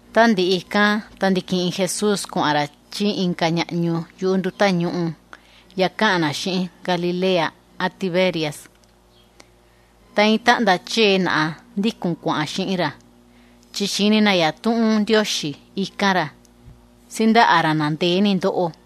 Tá ndiꞌi ikán ta ndi̱kiꞌin Jesús kuaꞌan ra chí inka ñaꞌñu yuꞌu nduta ñûꞌu ya káꞌan na xiꞌin Galilea án Tiberias. Ta iin táꞌnda chee naꞌa ndíkun kuaꞌan xiꞌin ra, chi xi̱ni na yatuꞌun Ndioxi íkan ra, síndaꞌa ra na ndee ni ndóꞌo.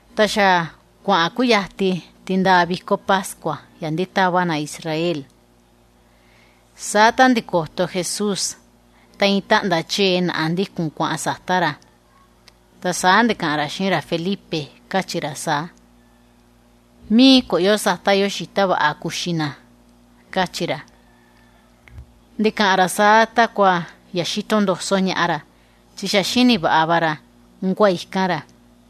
Ta xa kuaꞌan kúyati tindaa viko pascua ya ndítava na judío. Saa tá ndi̱koto Jesús ta iin táꞌnda chee naꞌa ndíkun kuaꞌan nuu ra, ta saa ndi̱kaꞌan ra xiꞌin ra Felipe, káchi ra saa: ―¿Mií kuꞌun yo sata yo xita vaꞌa kuxi na? ―káchi ra. Ndi̱kaꞌan ra saa takua xíto ndoso ñaꞌa ra, chi xa xíni vaꞌa va ra unkua ikan ra.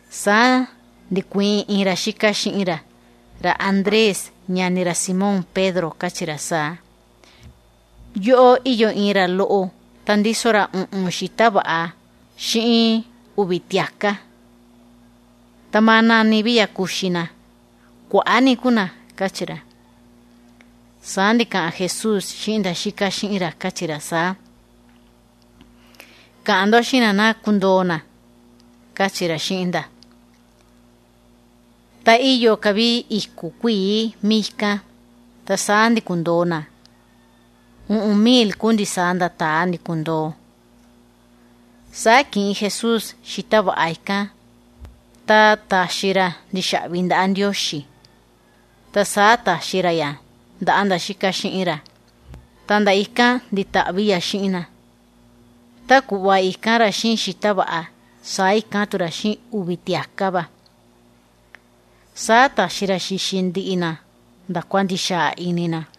Saa ndi̱kuiin inka ra xíka xiꞌin ra, ra Andrés, ñani ra Simón Pedro, káchi ra saa: ―Yóꞌó íyo iin ra loꞌo ta ndíso ra uꞌun xita vaꞌa xiꞌin uvi tiaka, sundi ¿án nani ya kuxi na? Yáꞌa ni kuaꞌa ku na ―káchi ra. Saa ndi̱kaꞌan Jesús xiꞌin nda ítaꞌan xiꞌin ra, káchi ra saa: ―Kaꞌan ndo xiꞌin na ná ndikundoo na ―káchi ra xiꞌin nda. Ta íyo ka vi iku kuii míi ikán, ta saa ndi̱kundoo na, iin kuꞌva uꞌun mil ku ndisaa nda taa ndi̱kundoo. Saa ki̱ꞌin Jesús xita vaꞌa ikán, ta ta̱xi ra ndixaꞌvi ndaꞌa Ndioxi, ta saa ta̱xi ra ya ndaꞌa nda ítaꞌan xiꞌin ra, ta nda ikán ndi̱taꞌvi ya xiꞌin na. Tá kuꞌva i̱kan ra xiꞌin xita vaꞌa, saa i̱kan tu ra xiꞌin uvi tiaka ikán va. Saa ta̱xi ra xi̱xi ndiꞌi na nda kua ndi̱xaa ini na.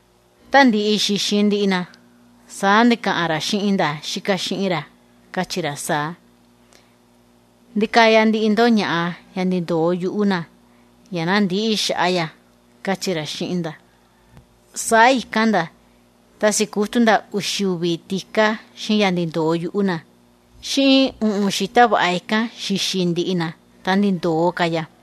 Tá ndi̱ꞌi xi̱xi ndiꞌi na, saa ndi̱kaꞌan ra xiꞌin nda ítaꞌan xiꞌin ra, káchi ra saa: ―Ndikaya ndiꞌi ndo ñaꞌa ya ndi̱ndoo yuꞌu na ya ná küita ya ―káchi ra xiꞌin nda. Saa i̱kan nda, ta si̱kutu nda uxi uvi tika xiꞌin ya ndi̱ndoo yuꞌu na, xiꞌin uꞌun xita vaꞌa ikán xi̱xi ndiꞌi na, ta ndi̱ndoo ka ya.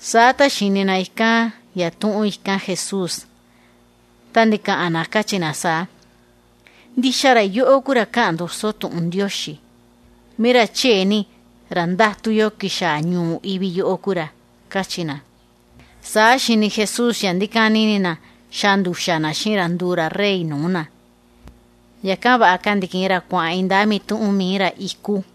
Saa tá xi̱ni na ikán yatuꞌun i̱kan Jesús, ta ndi̱kaꞌan na, káchi na saa: ―Ndixa ra yóꞌó ku ra káꞌan ndoso tuꞌun yuꞌu Ndioxi, mií ra chee ni, ra ndátun yo xaa ñuu ivi yóꞌó ku ra ―káchi na. Saa xi̱ni Jesús ya ndíkani ini na, xaa nduxa na xiꞌin ra nduu ra rey nuu na. Yakan vaꞌa ka ndi̱kiꞌin ra kuaꞌan iindaa mituꞌun mií ra iku.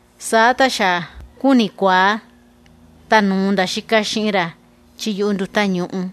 Saa tá xa kuaꞌan kútikuiin, ta nu̱u nda ítaꞌan xiꞌin ra chí yuꞌu nduta ñûꞌu.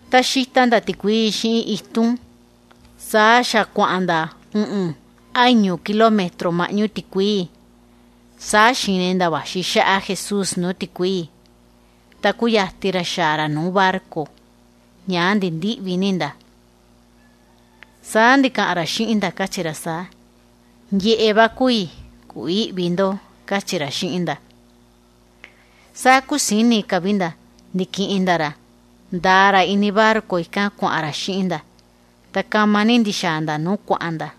Ta saa ndíxita nda tikuii xiꞌin itun, saa xa kuaꞌan nda uꞌun án iñu mil metro maꞌñu tikuii. Saa xi̱ni nda vaxi xáꞌa Jesús nuu tikuii, ta kúyati ra xaa ra nuu barco. Ñaa ndi̱ndiꞌvi ni nda. Saa ndi̱kaꞌan ra xiꞌin nda, káchi ra saa: ―¡Yeꞌe va ku i, ku ïꞌvi ndo! ―káchi ra xiꞌin nda. Saa kúsini ka vi nda, ndi̱kiꞌin nda ra, nda̱a ra ini barco ikán kuaꞌan ra xiꞌin nda, ta kama ni ndi̱xaa nda nuu kuaꞌan nda.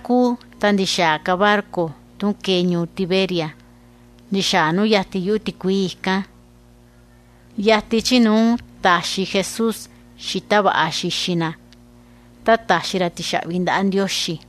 Saa kúu ta ndi̱xaa ka barco tun ke̱e ñuu Tiberias, ndi̱xaa nu yati yuꞌu tikuii ikán, nuu ta̱xi Jesús xita vaꞌa xi̱xi na yachi, tá ta̱xi ra tixaꞌvi ndaꞌa Ndioxi,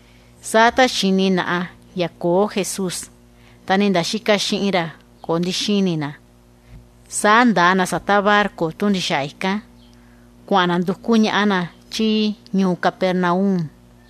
saa tá xi̱ni naꞌa ya köo Jesús, ta ni nda ítaꞌan xiꞌin ra köo ndi̱xini na, saa nda̱a na sata barco tun ndi̱xaa ikán, kuaꞌan na nduku ñaꞌa na chí ñuu Capernaum.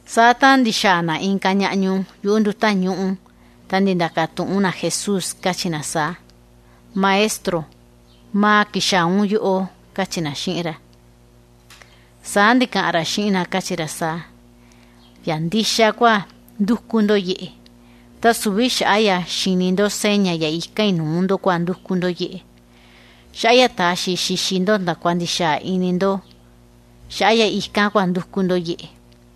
Saa tá ndi̱xaa na inka ñaꞌñu yuꞌu nduta ñûꞌu, ta ndi̱ndakan tuꞌun na Jesús, káchi na saa: ―Tata Rabí, ¿maa xa̱a un yóꞌó? ―káchi na xiꞌin ra. Saa ndi̱kaꞌan ra xiꞌin na, káchi ra saa: ―Ya ndixa kua ndúku ndo yeꞌe, ta süvi xaꞌa ya xi̱ni ndo seña ya i̱kan i nuu ndo kua ndúku ndo yeꞌe, chi xaꞌa ya ta̱xi i xi̱xi ndo ndakua ndi̱xaa ini va ndo kua ndúku ndo yeꞌe.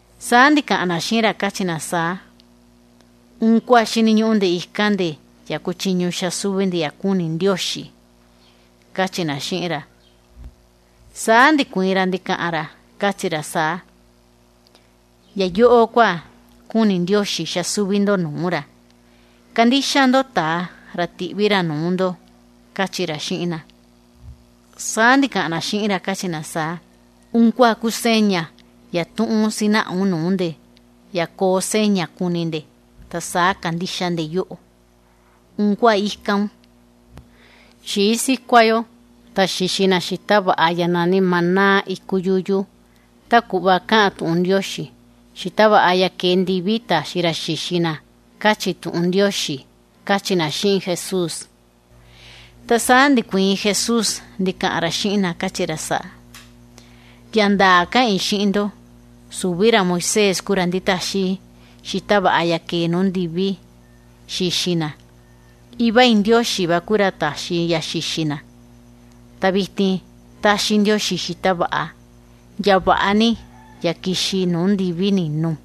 Saa ndi̱kaꞌan na xiꞌin ra, káchi na saa: ―¿Unkua xíniñuꞌu nde ikan nde, ya kuchiñu nde xaa súvi nde ya kúni Ndioxi? ―káchi na xiꞌin ra. Saa ndi̱kuiin ra ndi̱kaꞌan ra, káchi ra saa: ―Ya yóꞌó kua kúni Ndioxi xaa súvi ndo nuu ra: Kandixa ndo Taa, ra ti̱ꞌvi ra vaxi nuu ndo ―káchi ra xiꞌin na. Saa ndi̱kaꞌan na xiꞌin ra, káchi na saa: ―¿Unkua ku seña yatuꞌun sinaꞌa un nuu nde, ya koo seña kuni nde, ta saa kandixa nde yóꞌo̱? ¿Unkua íkan un? Xii sikua nde ta xi̱xi na xita vaꞌa ya náni maná iku yuyu, tá kuꞌva káꞌan tuꞌun Ndioxi: “Xita vaꞌa ya ke̱e nuu ndivi kua ta̱xi ra xi̱xi na”, káchi tuꞌun Ndioxi ―káchi na xiꞌin Jesús. Ta saa ndi̱kuiin Jesús ndi̱kaꞌan ra xiꞌin na, káchi ra saa: ―Ya ndaa káꞌan i xiꞌin ndo, süvi ra Moisés ku ra ndi̱taxi xita vaꞌa ya ke̱e nuu ndivi xi̱xi na, Iva i Ndioxi va ku ra ta̱xi ya xi̱xi na. Ta vitin táxi Iva i Ndioxi xita vaꞌa, ya ndaa vaꞌa ni, ya ki̱xi nuu ndivi ni̱nù.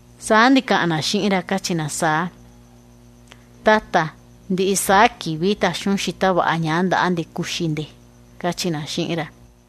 Saa ndi̱kaꞌan na xiꞌin ra, káchi na saa: ―Tata, vaꞌa taxi un xita vaꞌa ñaa ndaꞌa nde kuxi nde ndiꞌi saa kivi ―káchi na xiꞌin ra.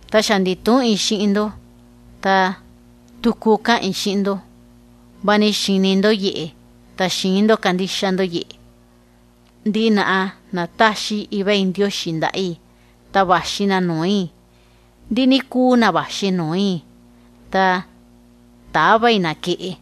Ta xa ndi̱tuꞌun i xiꞌin ndo, vani xi̱ni ndo yeꞌe ta xïin ndo kandixa ndo yeꞌe. Ndiꞌi na táxi Iva i Ndioxi ndaꞌa i, ta vaxi na nuu i, ta ndiꞌi na vaxi nuu i ta täva i na keꞌe.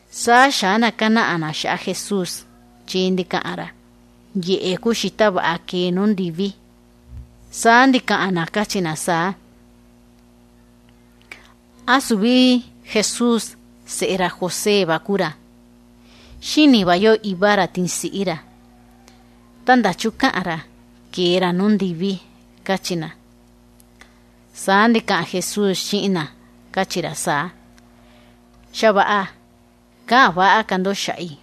Saa xa̱á nda judío kánaꞌa nda xaꞌa Jesús, chi ndi̱kaꞌan ra: “Yeꞌe ku xita vaꞌa ya ke̱e nuu ndivi”. Saa ndikaꞌan na káchi na saa: ―¿Án süvi Jesús seꞌe ra José va ku ra? Xíni va yo iva ra tin siꞌí ra. Ta ¿ndachu káꞌan ra ke̱e ra nuu ndivi? ―káchi na. Saa ndi̱kaꞌan Jesús xiꞌin na, káchi ra saa: ―Xa vaꞌa, käꞌan kuachi ka ndo xaꞌa i.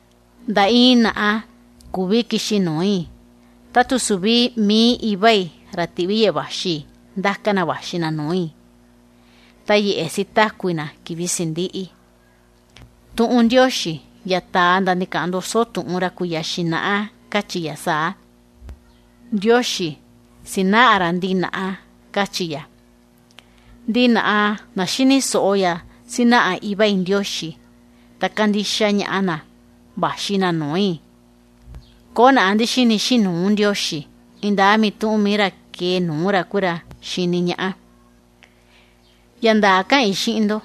Nda iin naꞌa küvi kixi nuu i, tá tu süvi mií Iva i, ra ti̱ꞌvi yeꞌe vaxi i, ku ra ndáka na vaxi na nuu i, ta yeꞌe sitaku i na kivi sindiꞌi. Tuꞌun Ndioxi ya ta̱a nda ndi̱kaꞌan ndoso tuꞌun yuꞌu ra kuiya xinaꞌa káchi ya saa: “Ndioxi sinaꞌa ra ndiꞌi naꞌa”, káchi ya. Ndiꞌi na xíni soꞌo ya sínaꞌa Iva i Ndioxi ta si̱kuaꞌa na nuu ra. Na ikán ku na vaxi nuu i. ’Köo naꞌa ndi̱xini xiꞌin nuu Ndioxi, iindaa mituꞌun mií ra ke̱e nuu ra ku ra xi̱ni ñaꞌa. Ya ndaa káꞌan i xiꞌin ndo: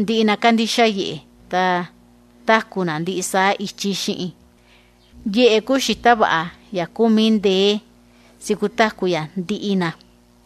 Ndiꞌi na kándixa yeꞌe ta xa táku na ndiꞌi saa kivi. Yeꞌe ku xita vaꞌa ya táxi kutaku naꞌa.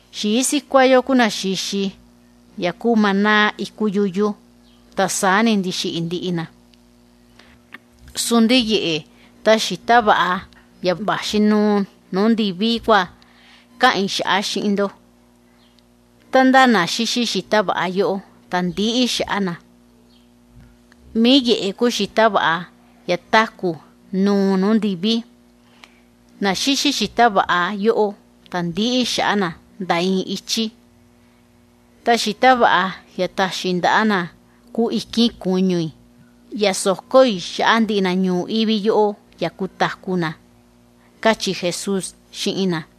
Xii sikua yo ku na xi̱xi ya ku maná iku yuyu, ta saa ni ndi̱xiꞌi ndiꞌi na. Sundi yeꞌe ta xita vaꞌa ya vaxi nùù nuu ndivi kua káꞌan i xaꞌa xiꞌin ndo, tá ndá na xíxi xíta vaꞌa yóꞌó ta ndïꞌi xaꞌa na. Mií yeꞌe ku xita vaꞌa ya táku ya nùù nuu ndivi, ndiꞌi na xíxi xita vaꞌa yóꞌó ta nda iin ichí ndïꞌi xaꞌa na. Ta xita vaꞌa ya táxi i ndaꞌa na ku ikin kuñu i, ya soko i xaꞌa ndiꞌi na ñuu ivi yóꞌó ya kutaku na ―káchi Jesús xiꞌin na.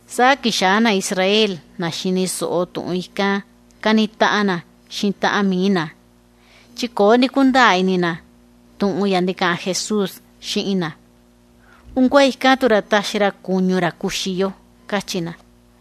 Saa xa̱á nda judío, nda xi̱ni soꞌo tuꞌun ikán káni taꞌan nda xiꞌin taꞌan mií nda, chi köo ndi̱kundaa ini nda tuꞌun ya ndi̱kaꞌan Jesús xiꞌin nda. ―¿Unkua ikan ra taxi ra kuñu ra kuxi yo? ―káchi nda.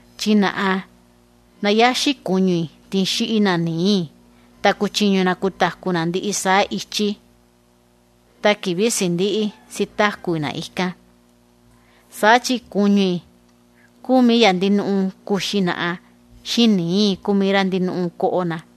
Chi na yáxi kuñu i tin xíꞌi na nií i ta kuchiñu na kutaku na ndiꞌi saa kivi, ta kivi sindiꞌi sitaku i na ikán. Saa chi kuñu i ku ya ndixa ni ndinuꞌu ndaa kuxi naꞌa xiꞌin nií i ku rá ndinuꞌu ni ndaa vaꞌa koꞌo na.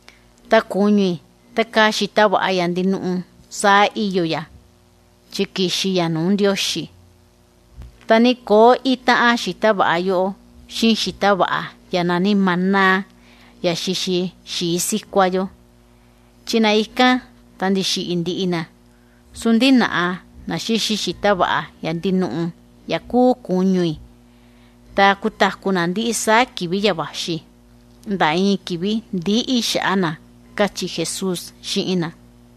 Ta kuñu i tá káa xita vaꞌa ya ndinuꞌu saa íyo ya, chi ki̱xi ya nuu Ndioxi. Ta ni köo ítaꞌan xita vaꞌa yóꞌó xiꞌin xita vaꞌa ya náni maná ya xi̱xi xii sikua yo, chi na ikán ta ndi̱xiꞌi ndiꞌi na. Sundi na xíxi xita vaꞌa ya ndinuꞌu ya kúu kuñu i ta kutaku na ndiꞌi saa kivi ya vaxi, nda iin kivi ndïꞌi xaꞌa na ―káchi Jesús xiꞌin na.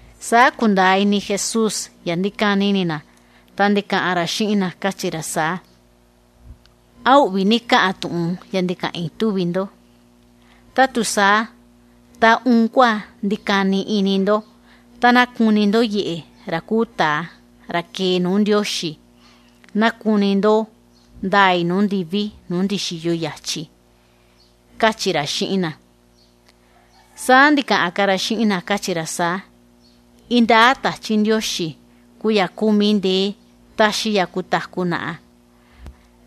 Saa ku̱ndaa ini Jesús ya ndíkani ini na, ta ndi̱kaꞌan ra xiꞌin na, káchi ra saa: ―¿Án uꞌvi ni káꞌan tuꞌun ya ndi̱kaꞌan i, túvi ndo? Tá tu saa ta, ¿unkua ndíkani ini ndo tá ná kuni ndo Yeꞌe, ra kúu Taa ra xa̱a ñuu ivi yóꞌó, ya ná ndaa i kuꞌun i nuu ndivi nuu ndi̱xiyo i yachi? ―káchi ra xiꞌin na. Saa ndi̱kaꞌan ka ra xiꞌin na, káchi ra saa: ―Iindaa Tachi Ndioxi ku ya kúu mií ndee táxi ya kutaku naꞌa,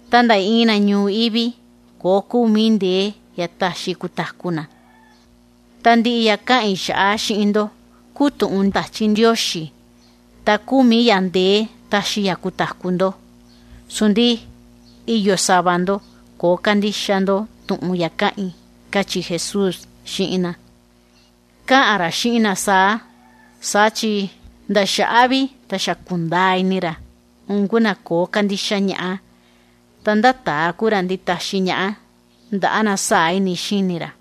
ta nda iin na ñuu ivi köo kúu mií ndee ya taxi na kutaku naꞌa. Ta ndiꞌi tuꞌun ya ndi̱kaꞌan i xiꞌin ndo, ku tuꞌun Tachi Ndioxi ta kúu mií ya ndee táxi ya táku ndo. Sundi íyo sava ndo köo kándixa tuꞌun ya káꞌan i ―káchi Jesús xiꞌin na. Káꞌan ra saa chi nda xaꞌa vi ku̱ndaa ini ra, unku na köo kándixa ñaꞌa, ta ndá taa ku ra nditaxi ñaꞌa ndaꞌa na sáa ini xíni ra.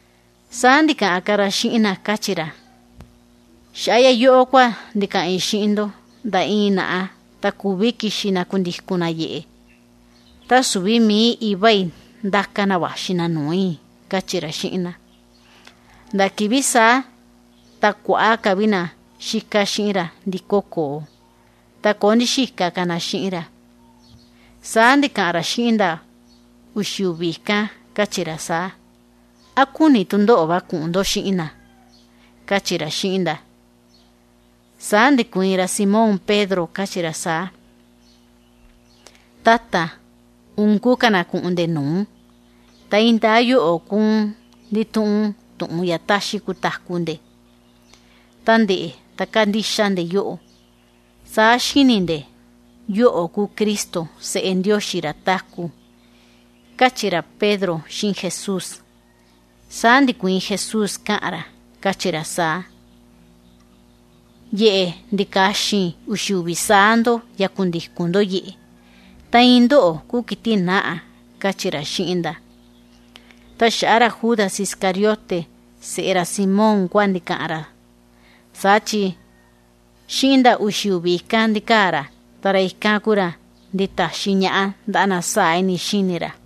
Saa ndi̱kaꞌan ka ra xiꞌin na, káchi ra saa: ―Xaꞌa ya yóꞌó kua ndi̱kaꞌan i xiꞌin ndo, nda iin naꞌa ta küvi kixi na kundikun na yeꞌe, tá tu süvi mií Iva i ku ra ndáka na vaxi na nuu i ―káchi ra xiꞌin na. Nda kivi saa ta kuaꞌa ni na ítaꞌan xiꞌin ra ndi̱ko koo, ta köo ndi̱xika ka na xiꞌin ra. Saa ndi̱kaꞌan ra xiꞌin nda uxi uvi ikán, káchi ra saa: ―¿Án kúni tu ndóꞌo̱ va kuꞌun ndo xiꞌin na? ―káchi ra xiꞌin nda. Saa ndi̱kuiin ra Simón Pedro, káchi ra saa: ―Tata, ¿unku ka na kuꞌun nde nuu? Ta iindaa yóꞌo̱ ku un ndítuꞌun tuꞌun ya táxi kutaku nde ndiꞌi saa kivi. Ta ndeꞌe kándixa nde yóꞌo̱, saa xíni nde yóꞌo̱ ku Cristo, Seꞌe Ndioxi ra táku ―káchi ra Pedro xiꞌin Jesús. Saa ndi̱kuiin Jesús káꞌan ra, káchi ra saa: ―Yeꞌe ndi̱kaxin i uxi uvi saa ndo ya kundikun ndo yeꞌe, ta iin ndóꞌo̱ ku kiti nǎꞌa ―káchi ra xiꞌin nda. Ta xaꞌa ra Judas Iscariote seꞌe ra Simón kua ndi̱kaꞌan ra, saa chi xiꞌin nda ítaꞌan xiꞌin ra kua ndíkaa ra ikán, ta ra ikán ku ra nditaxi ñaꞌa ndaꞌa na sáa ini xíni ra.